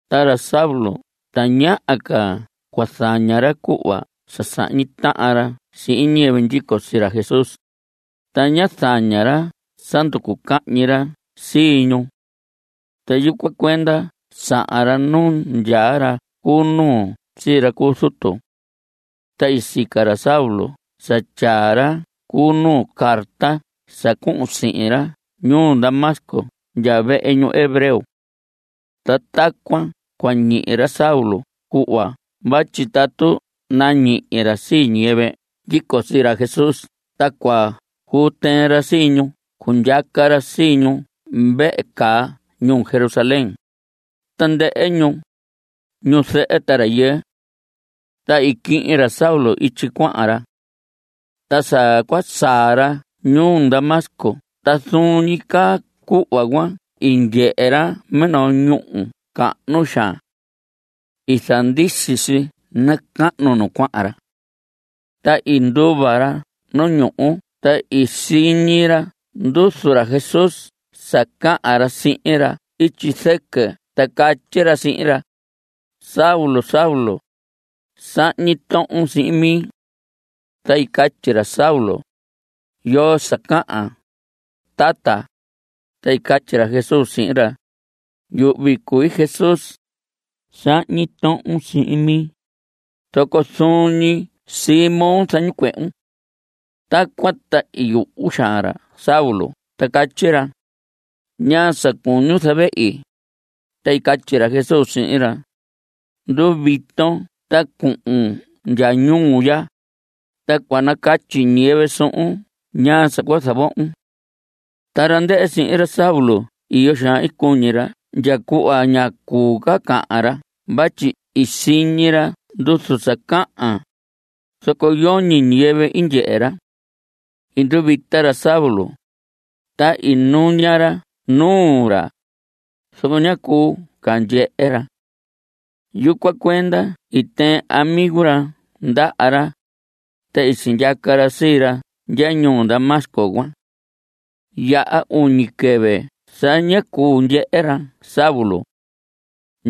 Ta ra Saulo tañaha ca cua zaña ra cuhva sa sahñi tahan ra sihin ñiyɨvɨ ndyico sii ra Jesús, ta ñá zaña ra sa nducu cahñi ra sii ñu. Ta yucuan cuenda sahan ra nu ndyaa ra cu nuu sii ra cu zutu. Ta i sica ra Saulo sa tyaa ra cu nuu carta sa cuhun sihin ra ñuu Damasco ndya vehe ñuhu hebreo. Ta tacuan cua ñihi ra Saulo cuhva vatyi tatu nañihi ra sii ñiyɨvɨ ndyico sii ra Jesús ta cua cuu tɨɨn ra sii ñu cundyaca ra sii ñu vehe caa ñuu Jerusalén, tandɨhɨ ñu, ñu zɨhɨ ta rayɨɨ. Ta i quihin ra Saulo ityi cuahan ra. Ta sa cua saa ra ñuu Damasco ta zuun ñi caa cuhva cuan i ndyehe ra minoo ñúhu cahnu xaan. I zandisi si nacahnu nu cuahan ra. Ta i nduva ra nu ñuhu ta i siñi ra nduzu ra Jesús sa cahan ra sihin ra ityi zɨquɨ ta catyi ra sihin ra: Saulo, Saulo. Sahñi tohon sihin mi. Ta i catyi ra Saulo: ¿Yoo sa cahan, tata? Ta i catyi ra Jesús sihin ra: Yuhvi cui Jesús. Sahñi tohon sihin mi, zoco zuun ñi sii moo zañicuehun. Tacuan ta i yuhu xaan ra Saulo ta catyi ra: ¿Ñaa sa cuñun zavehi? Ta i catyi ra Jesús sihin ra: Nduviton ta cuhun ndya ñuu ya, ta cua nacatyi ñiyɨvɨ suhun ñaa sa cua zavohon. Ta ra ndɨhɨ sihin ra Saulo iyo xaan i cuñi ra ndya cuhva ñá cuu ca cahan ra vatyi i siñi ra nduzu sa cahan, zoco yoñi ñiyɨvɨ i ndyehe ra. I nduvita ra Saulo, ta i nuña ra nuu ra, zoco ñá cuu ca ndyehe ra. Yucuan cuenda i tɨɨn amigo ra ndaha ra, ta i sindyaca ra sii ra ndya ñuu Damasco cuan. Yaha uñi quɨvɨ sa ñá cuu ndyehe ra Saulo.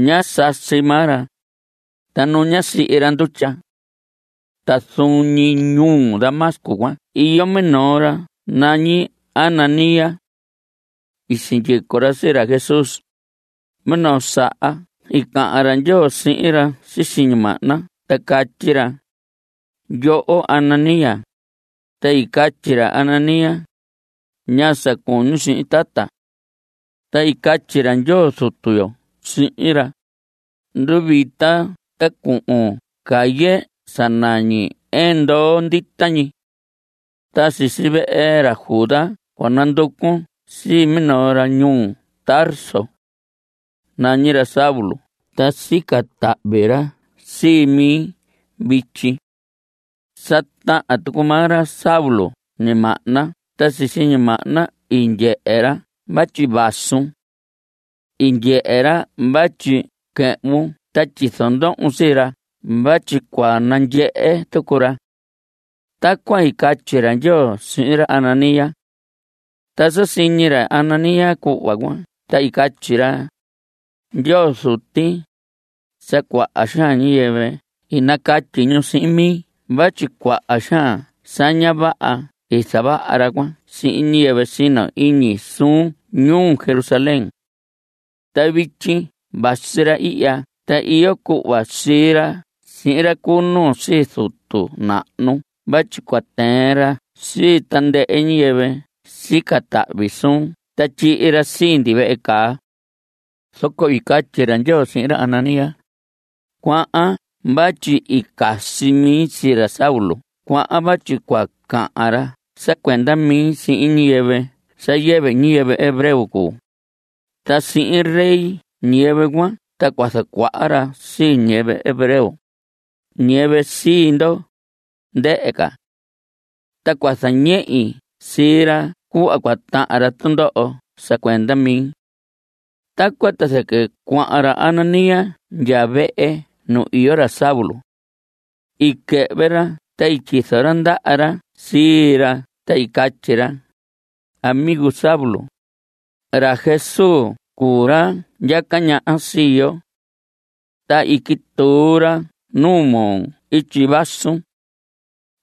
Ñá sasi maa ra, ta nu ñá sihi ra ndutya. Ta zuun ñi ñuu Damasco cuan iyo minoo ra nañi Ananías. I sindyico ra sii ra Jesús. Minoo saha i cahan ra Ndyoo sihin ra sisi ñimahna ta catyi ra: ¡Yoho Ananías! Ta i catyi ra Ananías: ¿Ñaa sa cuñun sihin, tata? Ta i catyi ra Ndyoo Zutu yo sihin ra: Nduvita ta cuhun calle sa nañi ɨɨn ndoo ndita ñi. Ta sisi vehe ra Judas cua nanducun sii minoo ra ñuu Tarso. Nañi ra Saulo ta sica tahvi ra sii mi vityi. Sa tahan tucu maa ra Saulo ñimahna ta sisi ñimahna i ndyehe ra vatyi vasun. I ndyehe ra vatyi quɨhvun ta tyizon ndohon sii ra vatyi cua nandyehe tucu ra. Tacuan i catyi ra Ndyoo sihin ra Ananías. Ta sa siñi ra Ananías cuhva cuan ta i catyi ra: Ndyoo Zuti, sa cuaha xaan ñiyɨvɨ i nacatyi ñu sihin mi vatyi cuaha xaan sa ña vaha i zavaha ra cuan sihin ñiyɨvɨ sino iñi suun ñuu Jerusalén. Ta vityi vasi ra ihya ta iyo cuhva sii ra sihin ra cu nuu sii zutu nahnu vatyi cua tɨɨn ra sii tandɨhɨ ñiyɨvɨ sica tahvi suun ta tyihi ra sii ndi vehe caa. Zoco i catyi ra Ndyoo sihin ra Ananías: Cuahan vatyi i casi mi sii ra Saulo cuan vatyi cua cahan ra sa cuenda mi sihin ñiyɨvɨ sa yɨvɨ ñiyɨvɨ hebreo cuu, ta sihin rey ñiyɨvɨ cuan ta cua zacuaha ra sii ñiyɨvɨ hebreo, ñiyɨvɨ sii ndo, ndɨhɨ ca. Ta cua zañehi sii ra cuhva cua tahan ra tundoho sa cuenda mi. Tacuan ta zɨquɨ cuahan ra Ananías ndya vehe nu iyo ra Saulo. I quɨhvɨ ra ta i tyizo ra ndaha ra sii ra ta i catyi ra: Amigo Saulo, ra Jesús cuu ra ndyaca ñaha sii yo. Ta i quituu ra nuu moo ityi vasun.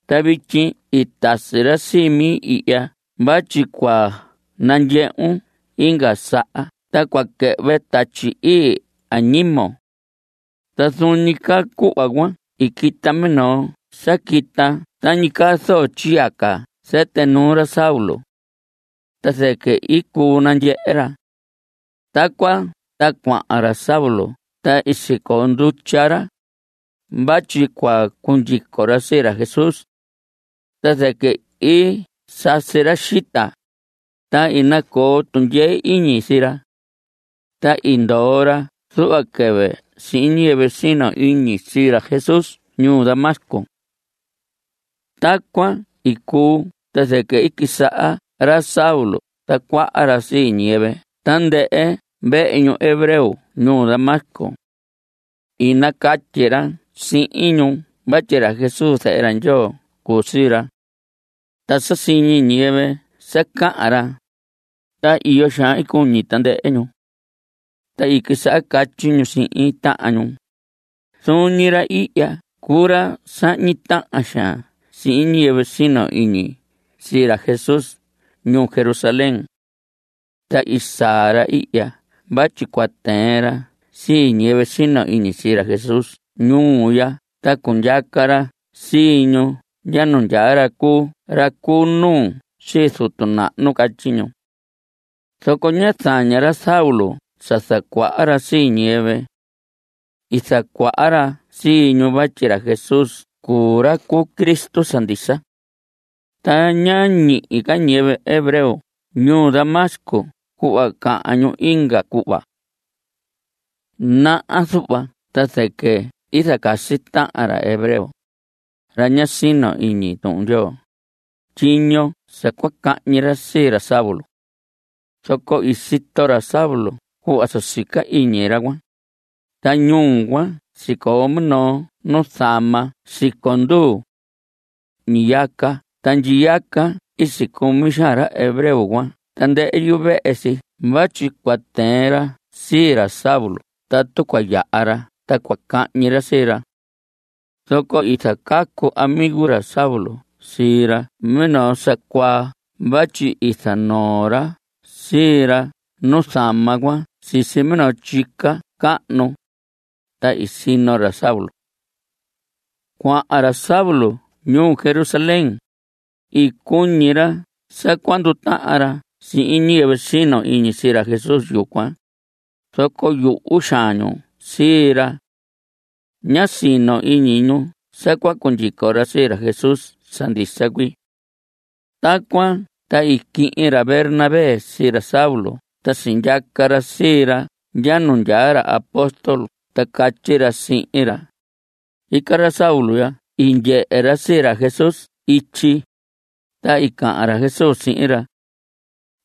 Ta vityi i tasi ra sii mi ihya vatyi cua nandyehun inga saha ta cua quɨhvɨ Tatyi Ii añimon. Ta zuun ñi caa cuhva cuan i quita minoo sa quita tañi caa zoo tyiyaca sɨtɨ nuu ra Saulo. Ta zɨquɨ i cuu nandyehe ra. Tacuan ta cuahan ra Saulo ta i sicoo ndutya ra (vatyi cua cundyico ra sii ra Jesús). Ta zɨquɨ i sasi ra xita, ta i nacoo tundyee iñi sii ra. Ta i ndoo ra zuhva quɨvɨ sihin ñiyɨvɨ sino iñi sii ra Jesús ñuu Damasco. Tacuan i cuu ta zɨquɨ i quisaha ra Saulo zacuaha ra sii ñiyɨvɨ tandɨhɨ vehe ñuhu hebreo ñuu Damasco. I nacatyi ra sihin ñu vatyi ra Jesús, zehe Ndyoo cuu sii ra. Ta sa siñi ñiyɨvɨ sa cahan ra, ta iyo xaan i cuñi tandɨhɨ ñu. Ta i quisaha catyi ñu sihin tahan ñu: Zuun ñi ra ihya cuu ra sahñi tahan xaan sihin ñiyɨvɨ sino iñi sii ra Jesús ñuu Jerusalén. Ta i saa ra ihya vatyi cua tɨɨn ra sii ñiyɨvɨ sino iñi sii ra Jesús ñuu ya ta cundyaca ra sii ñu ndya nu ndyaa ra cu nuu sii zutu nahnu. Catyi ñu. Zoco ñá zaña ra Saulo sa zacuaha ra sii ñiyɨvɨ. I zacuaha ra sii ñu vatyi ra Jesús cuu ra cu Cristo sa ndisa. Ta ñá ñihi ca ñiyɨvɨ hebreo ñuu Damasco cuhva cahan ñu inga cuhva. Naha zuhva ta zɨquɨ i zacasi tahan ra hebreo, ra ña sino iñi Tuhun Ndyoo, tyiño sa cua cahñi ra sii ra Saulo. Zoco i sito ra Saulo cuhva sa sica iñi ra cuan. Ta ñuu cuan sicoo minoo nuzama siconduu. Ñiyaca ta ndyiyaca i sicumi xaan ra hebreo cuan tandɨhɨ yuvehe si vatyi cua tɨɨn ra sii ra Saulo tatu cua yaha ra ta cua cahñi ra sii ra. Zoco i zacacu amigo ra Saulo sii ra minoo sa cuaa vatyi i zanoo ra sii ra nuzama cuan sisi minoo tyica cahnu, ta i sino ra Saulo. Cuahan ra Saulo ñuu Jerusalén. I cuñi ra sa cua ndutahan ra sihin ñiyɨvɨ sino iñi sii ra Jesús yucuan, zoco yuhu xaan ñu sii ra. Ñá sino iñi ñu sa cua cundyico ra sii ra Jesús sa ndisa cuii. Tacuan ta i quihin ra Bernabé sii ra Saulo ta sindyaca ra sii ra ndya nu ndyaa ra apóstol ta catyi ra sihin ra: Ica ra Saulo ya i ndyehe ra sii ra Jesús ityi, ta i cahan ra Jesús sihin ra.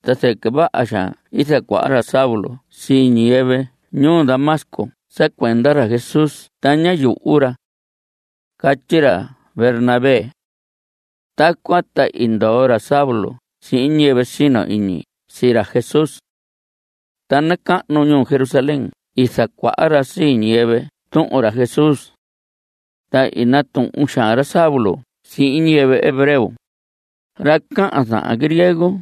Ta zɨquɨ vaha xaan i zacuaha ra Saulo sii ñiyɨvɨ ñuu Damasco sa cuenda ra Jesús ta ñá yuhu ra. Catyi ra Bernabé. Tacuan ta i ndoo ra Saulo sihin ñiyɨvɨ sino iñi sii ra Jesús. Ta nacahnu ñuu Jerusalén i zacuaha ra sii ñiyɨvɨ tuhun ra Jesús. Ta i natuhun xaan ra Saulo sihin ñiyɨvɨ hebreo, ra cahan zahan griego.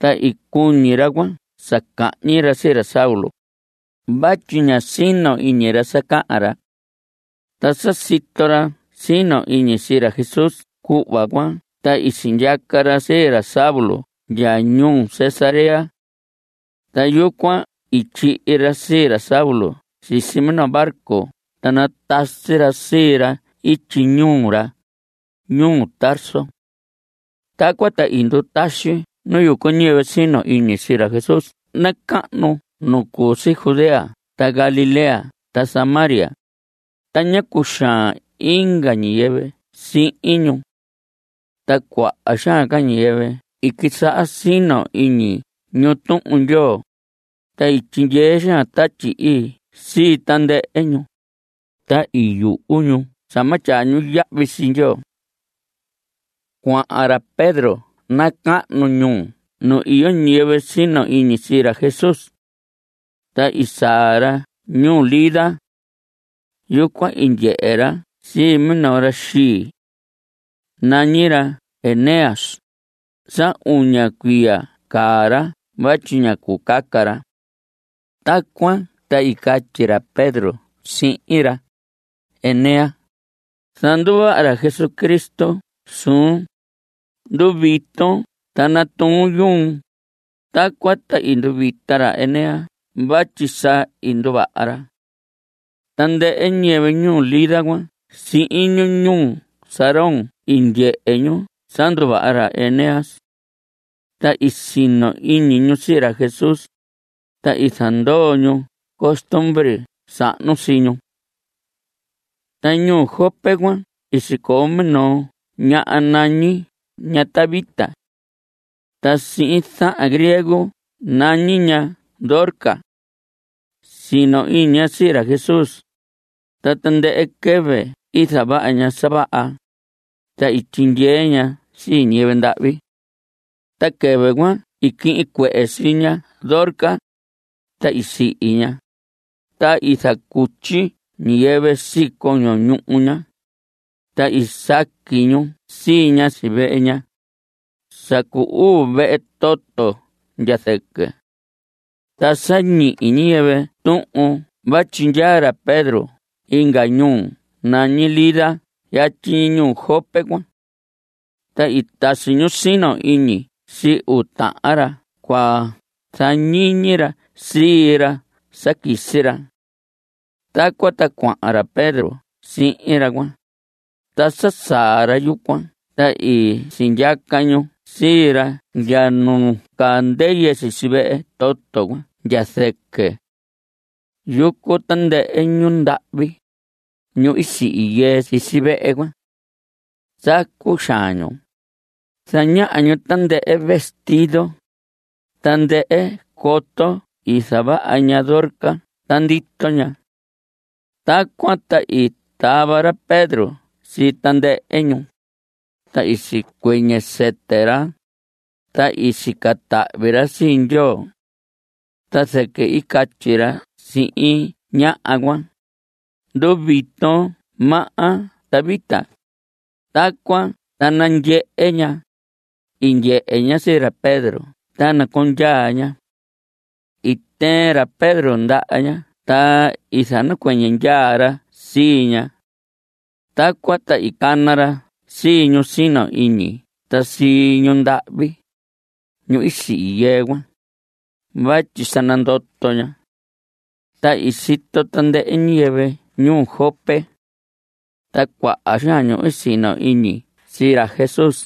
Ta i cuñi ra cuan sa cahñi ra sii ra Saulo (vatyi ñá sino iñi ra sa cahan ra). Ta sa sito ra sino iñi sii ra Jesús cuhva cuan ta i sindyaca ra sii ra Saulo ndya ñuu Cesarea. Ta yucuan i tyihi ra sii ra Saulo sisi minoo barco ta natasi ra sii ra ityi ñuu ra, ñuu Tarso. Tacuan ta i ndutaxi nu yucu ñiyɨvɨ sino iñi sii ra Jesús nacahnu nu cu si Judea ta Galilea ta Samaria. Ta ñá cuxaan inga ñiyɨvɨ sihin ñu. Ta cuaha xaan ca ñiyɨvɨ i quisaha sino iñi ñu Tuhun Ndyoo, ta i tyindyee xaan Tatyi Ii sii tandɨhɨ ñu. Ta i yuhu ñu sa ma tyaa ñu yahvi sii Ndyoo. Cuahan ra Pedro nacahnu ñuu nu iyo ñiyɨvɨ sino iñi sii ra Jesús. Ta i saa ra ñuu Lida. Yucuan i ndyehe ra sii minoo ra xii. Nañi ra Eneas. Sa uña cuiya caa ra vatyi ñá cuu caca ra. Tacuan ta i catyi ra Pedro sihin ra: Eneas, zanduvaha ra Jesucristo suun. Nduviton ta natuun yuun. Tacuan ta i nduvita ra Eneas vatyi sa i nduvaha ra. Tandɨhɨ ñiyɨvɨ ñuu Lida cuan sihin ñu ñuu Sarón i ndyehe ñu sa nduvaha ra Eneas. Ta i sino iñi ñu sii ra Jesús. Ta i zandoo ñu costumbre sahnu sii ñu. Ta ñuu Jope cuan sicoo minoo ñaha nañi ña Tabita. Ta sihin zahan griego nañi ña Dorcas. Sino iñi ña sii ra Jesús, ta tandɨhɨ quɨvɨ i zavaha ña sa vaha, ta i tyindyee ña sii ñiyɨvɨ ndahvi. Ta quɨvɨ cuan i quihin cuehe sii ña Dorcas, ta i sihi ña, ta i zacutyi ñiyɨvɨ sii coño ñuhu ña, ta i saqui ñu sii ña si vehe ña, sa cu uu vehe toto ndya zɨquɨ. Ta sa ñihi ñiyɨvɨ tuhun vatyi ndyaa ra Pedro inga ñuu nañi Lida yatyi ñi ñuu Jope cuan. Ta i tasi ñu sino iñi sii uu tahan ra cua zañiñi ra sii ra sa quisi ra. Tacuan, ta cuahan ra Pedro sihin ra cuan. Ta sa saa ra yucuan ta i sindyaca ñu sii ra ndya nu caa ndɨyɨ sisi vehe toto cuan ndya zɨquɨ. Yucu tandɨhɨ ñu ndahvi, ñu sihi yɨɨ, sisi vehe cuan. Sacu xaan ñu. Zañaha ñu tandɨhɨ vestido, tandɨhɨ coto i zavaha ña Dorcas ta ndito ña. Tacuan ta i tava ra Pedro sii tandɨhɨ ñu, ta i sicuɨñɨ sɨtɨ ra, ta i sica tahvi ra sii Ndyoo. Ta zɨquɨ i catyi ra sihin ñaha cuan: Nduviton maha Tabita. Tacuan ta nandyehe ña. I ndyehe ña sii ra Pedro ta nacundyaa ña. I tɨɨn ra Pedro ndaha ña ta i zanacuɨñɨ ndyaa ra sii ña. Tacuan ta i cana ra sii ñu sino iñi ta sii ñu ndahvi, ñu sihi yɨɨ cuan, vatyi sa nandoto ña. Ta i sito tandɨhɨ ñiyɨvɨ ñuu Jope. Ta cuaha xaan ñu i sino iñi sii ra Jesús.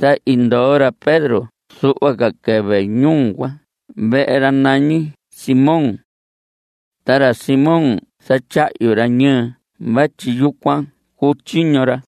Ta i ndoo ra Pedro zuhva ca quɨvɨ ñuu cuan vehe ra nañi Simón. Ta ra Simón zatyahyu ra ñɨɨ vatyi yucuan cuu tyiño ra.